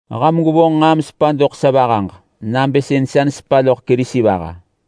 Ham gwevonġ nġaa mesepa doḳ sa vahaġ nabë sën sa nesepa loḳ Kerisi vaha.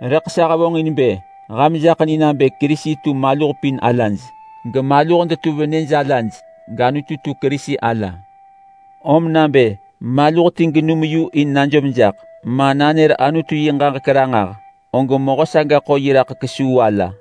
Rëḳ sa hevonġin bë ham jaḳ ni nabë Kerisi tu maluh pin alaj, gemaluh detu venëj ala, gAnutu tu Kerisi ala. Om nabë maluh ti genum yu in najom jaḳ, ma nanër Anutu yi ġaġek ranġah, og mehö saga ḳo yi raḳ kesuu ala.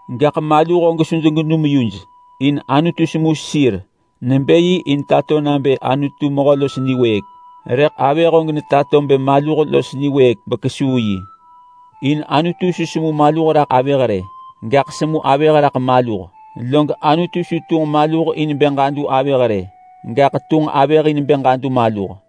Gaḳ maluh og su degenum yuj in Anutu semu sir nebë yi in tato nabë Anutu mehö los niwëëk, rëḳ avëh og tato nebë maluh los niwëëk bekesuu yi. In Anutu su semu maluh raḳ avëh rë, gaḳ semu avëh raḳ maluh. Log Anutu su tunġ maluh in bë ġadu avëh rë, gaḳ tunġ avëh in bë ġadu maluh.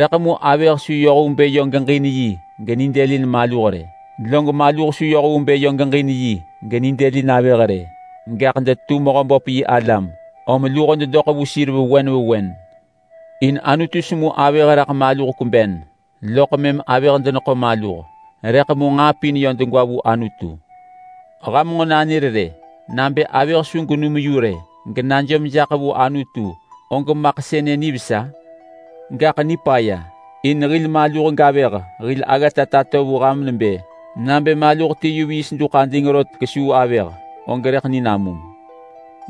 Rëḳ mu avëh su yoh vu bë yö geġin yi genidëlin maluh rë, log maluh su yoh vu bë yö geġin yi genidëlin avëh rë, gaḳ detu Mehöböp yi alam, om luho dedoḳ vu sir vewen vewen. In Anutu semu avëh raḳ maluh kweben, loḳ mëm avëh deneḳo maluh. Rëḳ mu degwa vu Anutu. Ham nġo nanër rë. Nabë avëh su genum yu rë genajom jaḳ vu Anutu og maḳ sënë nivesa? Gaḳ nipaya, in hil maluh gavëh hil aggata tato vu ham nebë: Nabë maluh ti yu viis duḳ ading rot kesuu avëh, og rëḳ ni namum.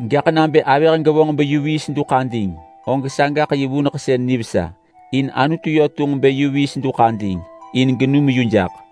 Gaḳ nabë avëh gevonġ beyu viis duḳ ading, og sagaḳ yi vuneḳsën nivesa. In Anutu yö tunġ bë yu viis duḳ ading in genum yu jaḳ.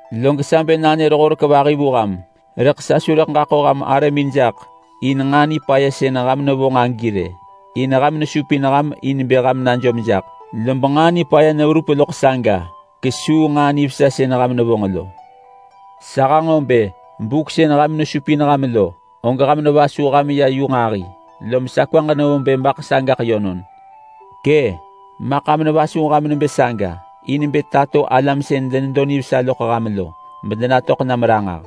Log sa bë nanër horek vahi vu ham, rëḳ sa su rëḳ ġaḳo ham arëmin jaḳ in nġaa nipaya sën ham nevonġ agi rë. In ham nesupin ham in bë ham najom jaḳ, lob nġaa nipaya neverup loḳ saga kesuu nġaa nivesa sën ham nevonġ lo. Sa hanġo bë buk sën ham nesupin ham lo, og ham nevasuh ham ya yu nġahi, lob sa kwaġ nevo bë maḳ sagaḳ yönon. Kë’! Maḳ ham nevasuh ham nebë saga in bë tato alam sën denedo nivesa loḳ ham lo medenatöḳ nam ranġah.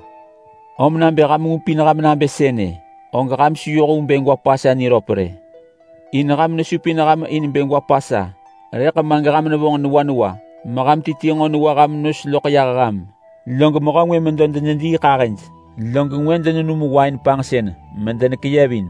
Om nabë ham ngupin ham nabë sënë, og ham su yoh vu bë gwa Pasa niröp rë. In ham nesupin ham in bë ham gwa Pasa, rëḳ ma geham nevonġ newa newa meham ti ti nġo newa ham nos loḳ yah ham. Log mehö ngwë medo denediiḳahëj, log ngwë denenum wain panġsën medenekeyevin.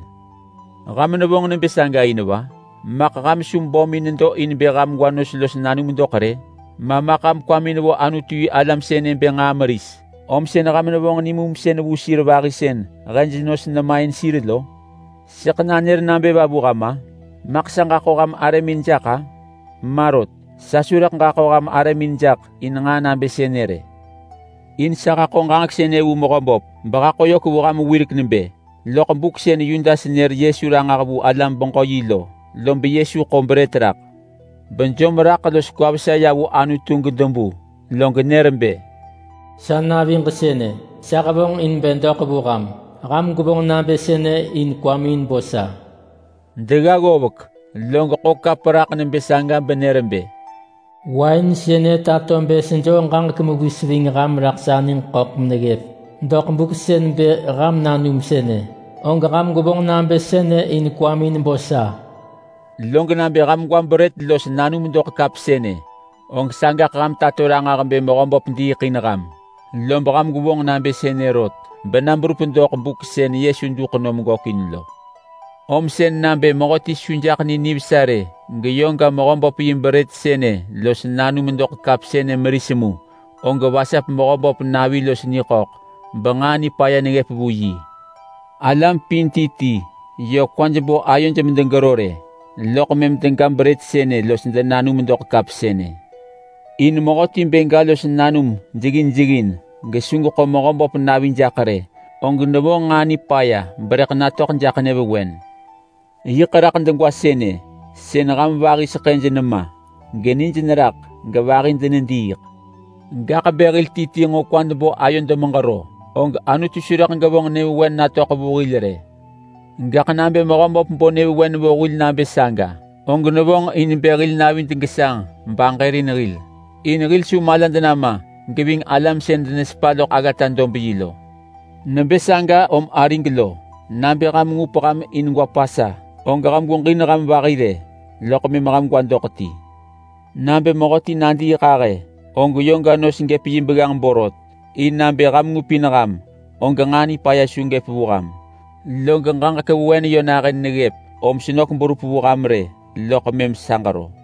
Ham nevonġ nebë saga in va? Maḳ ham su bömin nedo in bë ham gwa los nanum doḳ rë? Ma maḳ ham kwamin vo Anutu-yi-alam sënë bë nġaa meris, om sën ham nevonġ nimumsën vu sir vahi sën hej nos nemain sir lo? Sëḳ nanër nabë va vu ham-a? Maḳ sa ġaḳo ham arëmin jaḳ-a? Ma rot! Sa su rëḳ ġaḳo ham arëmin jaḳ in nġaa nabë sënë rë. In sa haḳo ġaġek sënë vu Mehöböp behaḳo yök vu ham wirek nebë: Loḳ buk sën Yudas nër Yesu ranġah vu alam-beġö-yi lo, lob Yesu ḳo brët rak bejom raḳ los kwa vesa ya vu Anutu gedebu, log nër bë, “Sa naviġ sënë! Sa hevonġ in bë doḳ vu ham! Ham gwevonġ nabë sënë in kwamin bo sa.” Degga ggovek log ḳo kap raḳ nebë saga benër bë, “Wain sënë tato bë sejoo ġaġek mewis ving ham raḳ sa niġ ḳöḳ meneggëp. Doḳ buk sën bë ham nanum sënë, og ham gwevonġ nabë sënë in kwamin bo sa.” Log nabë ham gwa brët los nanum doḳ kap sënë, og sagaḳ ham tato ranġah bë Mehöböp diiḳ in ham. Lob ham gwevonġ nabë sënë rot bena berup doḳ buk sën Yesu duḳ nom gökin lo. Om sën nabë mehöti su jaḳ ni nivesa rë geyö ga Mehöböp yi brët sënë los nanum doḳ kap sënë meris mu, og vasap Mehöböp navi los niḳöḳ benġaa nipaya neggëp vu yi. Alam pin ti ti yö kwaj bo ayoj medegero rë, loḳ mëm dega brët sënë los denanum doḳ kap sënë. In mehöti bë ga los nanum jeggin jeggin gesu geḳo Mehöböp navi jaḳ rë, og nevonġ nġaa nipaya berëḳ natöḳ jaḳ nyëvewen. Yiḳ raḳ degwa sënë sën ham vahi seḳëj nema genij neraḳ gevahi denediiḳ. Gaḳ bë hil ti ti nġo kwad bo ayod meġero, og Anutu su rëḳ gevonġ nyëvewen natöḳ vu hil rë. Gaḳ nabë Mehöböp bo nyëvewen vu hil nabë saga, og nevonġ in bë hil navid gesanġ baġërin hil in hil su malad nama geving alam sën denesepa loḳ aggata-dob-yi lo. Nebë saga om arig lo, nabë ham ngup ham in gwa Pasa, og ham gweġin ham vahi rë, loḳ mëm ham gwa doḳ ti. Nabë mehöti nadiiḳahë, og yö ga nos gëp yi begganġ borot, in nabë ham ngupin ham og nġaa nipaya su gëp vu ham. Log ġaġek vewen yö nahën neggëp, om senök berup vu ham rë loḳ mëm sa ġero.